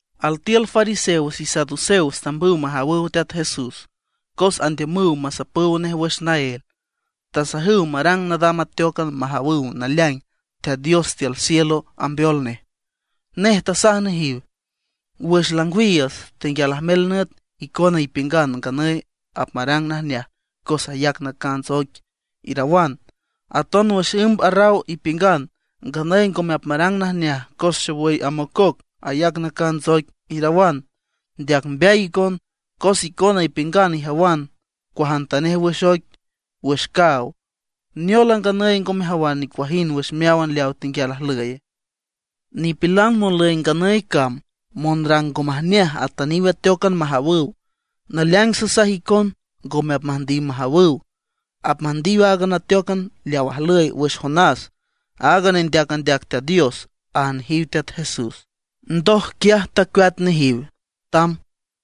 Altiül fariseos y saduceos tambüw majawüw Teat Jesús cos andiümüw masapüw nej wüx naél. Tasajüw marang nadam ateócan majawüw naleaing Teat Dios tiül cielo ambeol nej. Nej tasaj nejiw: ―Wüx langwiiüts, tenguial ajmel nüt, icona ipiüngan: “Nganüy apmarang najneaj cos ayac nacants oic”, irawan. Aton wüx ümb arraw ipiüngan: “Nganüy ngome apmarang najneaj cos xowüy amococ, ayac nacants oic”, irawan. ¡Ndeac mbeay icon! Cos icona ipiüngan ijawan cuajantanej wüx oic, wüx caaw, ¿neol a nganüy ngo mejawan nicuajind wüx meáwan leawa tenguial ajlüye? Nipilan monlüy nganüy cam monrang ngo majneaj atüniw ateócan majawüw. Naleaing sasaj icon ngome apmüjndiw majawüw. Apmüjndiw áagan ateócan leaw tajlüy wüx Jonás, aaga nendeac andeac Teat Dios ―aj nejiw Teat Jesús. Ndoj quiaj tacueat nejiw, tamb.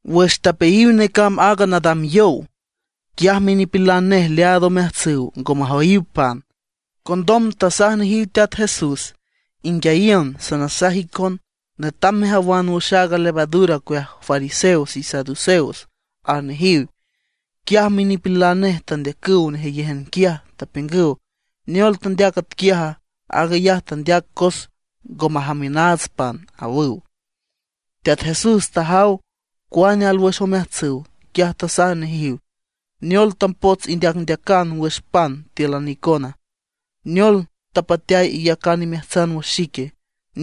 Wüx tapeayiw necamb aaga nadam yow, quiaj minipilan nej leaad omeajtsüw ngo majoyiw pan. Condom tasaj nejiw Teat Jesús: ―Inguiayiün, sanasaj icon, netam mejawan wüx aaga levadura ocueaj fariseos y saduceos ―aj nejiw. Quiaj minipilan nej tandeacüw nejeyéjan quiaj, tapiüngüw: ―¿Neol tandeac atquiaja? Aag ayaj tandeac cos ngo majamiünaats pan ―awüw. Teat Jesús tajaw cuane alwüx omeajtsüw. Quiaj tasaj nejiw: ―¿Neol tapots indeacndeacan wüx pan tíülan icona? ¿Neol tapateay iyacan imeajtsan wüx xique?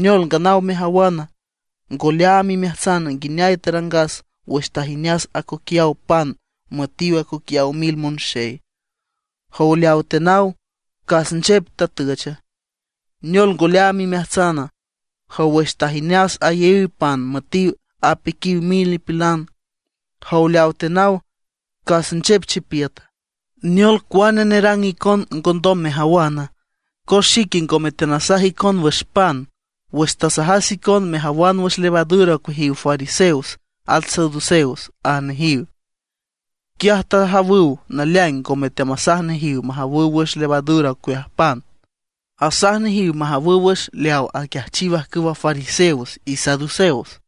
¿Neol nganaw mejawan, ngo leaam imeajtsan nguineay tarangas wüx tajineas acoquiaw pan müetiw acoquiaw mil monxey? Jow leaw tenaw, ¿cas nchep tatücha? ¿Neol ngo leaam imeajtsana? Jow, wüx tajineas ayaíw pan müetiw apiquiw mil nipilan, ¿jow leaw tenaw, cas nchep chipiüta? ¿Neol cuane nerang icon ngondom mejawana? Cos xique ngome teanasaj icon wüx pan wüx tasajas icon mejawan wüx levadura ocueajiw fariseos at saduceos ―aj nejiw. Quiaj tajawüw naleaing ngome teamasaj nejiw majawüw wüx levadura ocueaj pan, asaj nejiw majawüw wüx leaw aquiajchiw ajcüwa fariseos y saduceos.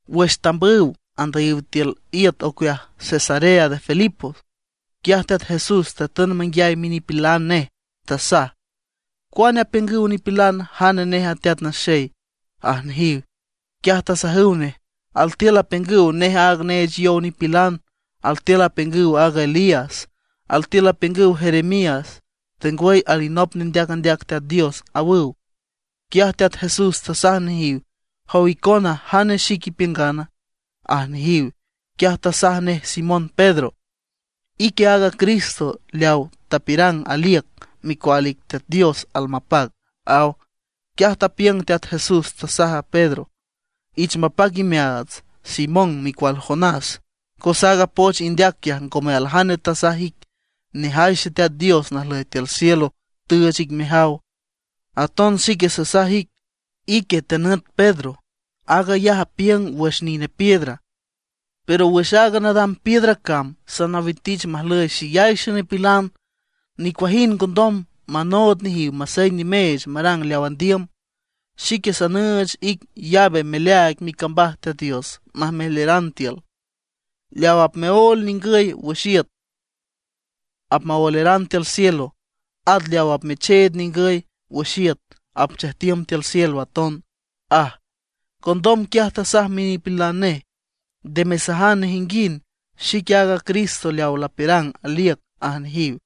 Wüx tambüw andüyiw tiül iüt ocueaj Cesarea de Filipo, quiaj Teat Jesús tatün manguiay minipilan nej, tasaj: ―¿Cuane apiüngüw nipilan jane nej a Teat Naxey? ―aj nejiw. Quiaj tasajüw nej: ―Altiül apiüngüw nej aaga Juan neech yow nipilan. Altiül apiüngüw aaga Elías, altiül apiüngüw Jeremías, tengwüy alinop nendeac andeac Teat Dios ―awüw. Quiaj Teat Jesús tasaj nejiw: ―Jow icona, ¿jane xic ipiüngana? ―aj nejiw. Quiaj tasaj nej Simón Pedro: ―Ique aaga Cristo leaw tapiürang aliüc, Micual ic Teat Dios almapac ―aw. Quiaj tapiüng Teat Jesús, tasaj Pedro: ―Ich mapac imeaats, Simón micual Jonás, cos aaga poch indeac quiaj ngome aljane tasaj ic, nejay Xeteat Dios najlüy tiül cielo tüüch ic mejaw. Aton xique sasaj ic, ique tenüt Pedro, aag ayaj apiüng wüx nine piedra. Pero wüx aaga nadam piedra cam sanawitich majlüy xeyay xenipilan. Nicuajind ngondom manood nejiw masey nimeech marang leaw andiüm. Xique sanüüch ic llave meleaaig micambaj Teat Dios majmeleran tiül. Leaw apmeóel ningüy wüx iüt apmaoeleran tiül cielo; at leaw apmecheed ningüy wüx iüt apchejtiüm tiül cielo aton ―aj. Condom quiaj tasaj minipilan nej: ―Nde mesajan nejinguind xique aaga Cristo leaw lapiürang aliüc ―aj nejiw.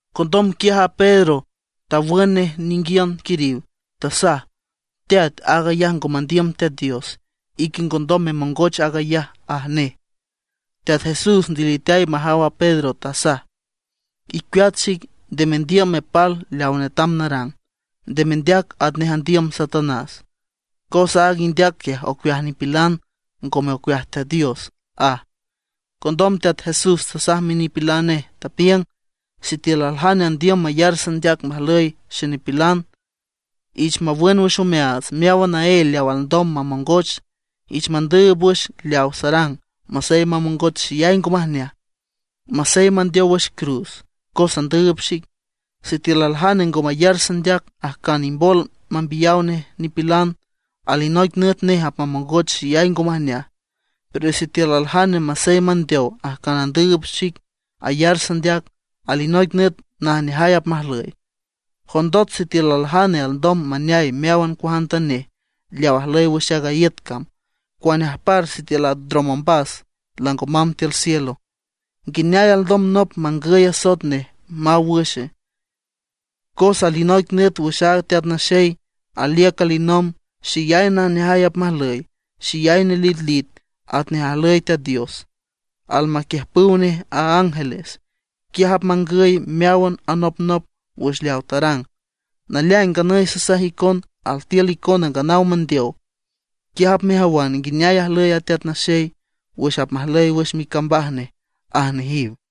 Condom quiaj a Pedro tawün nej ninguiün quiriw, tasaj: ―¡Teat, aag ayaj ngo mandiüm Teat Dios; ique ngondom memongoch aag ayaj! ―aj nej. Teat Jesús ndiliteay majaw a Pedro, tasaj: ―Icueat xic, nde mendiüm mepal leaw netam narang. Nde mendeac atnej andiüm Satanás. Cos aaga indeac quiaj ocueaj nipilan, ngome ocueaj Teat Dios ―aj. Condom Teat Jesús tasaj minipilan nej, tapiüng: ―Sitiül aljane andiüm mayar sandeac majlüy xenipilan, ich mawün wüx omeaats meáwan naél leaw alndom mamongoch, ich mandüüb wüx leawa sarang masey mamongoch xeyay ngo majneaj, masey mandeow wüx cruz cos andüüb xic. Sitiül aljane ngo mayar sandeac ajcan imbol mambiyaw nej nipilan, alinoic nüt nej apmamongoch xeyay ngo majneaj. Pero sitiül aljane masey mandeow ajcan andüüb xic ayar sandeac, alinoic nüt najneajay apmajlüy. ¿Jondot sitiül aljane alndom maneay meáwan cuajantanej leaw ajlüy wüx aaga iüt cam, cuane ajpar sitiül apndrom ombas lango mamb tiül cielo? ¿Nguineay alndom nop mangüy asoet nej maw wüxe? Cos alinoic nüt wüx aaga Teat Naxey aliüc alinomb xeyay najneajay apmajlüy, xeyay nelitlit atnej ajlüy Teat Dios, almaquiüjpüw nej a ángeles. Quiaj apmangüy meáwan anopnop wüx leaw tarang. Naleaing nganüy sasaj icon altiül icona nganaw mandeow, quiaj apmejawan nguineay ajlüy a Teat Naxey wüx apmajlüy wüx micambaj nej ―aj nejiw.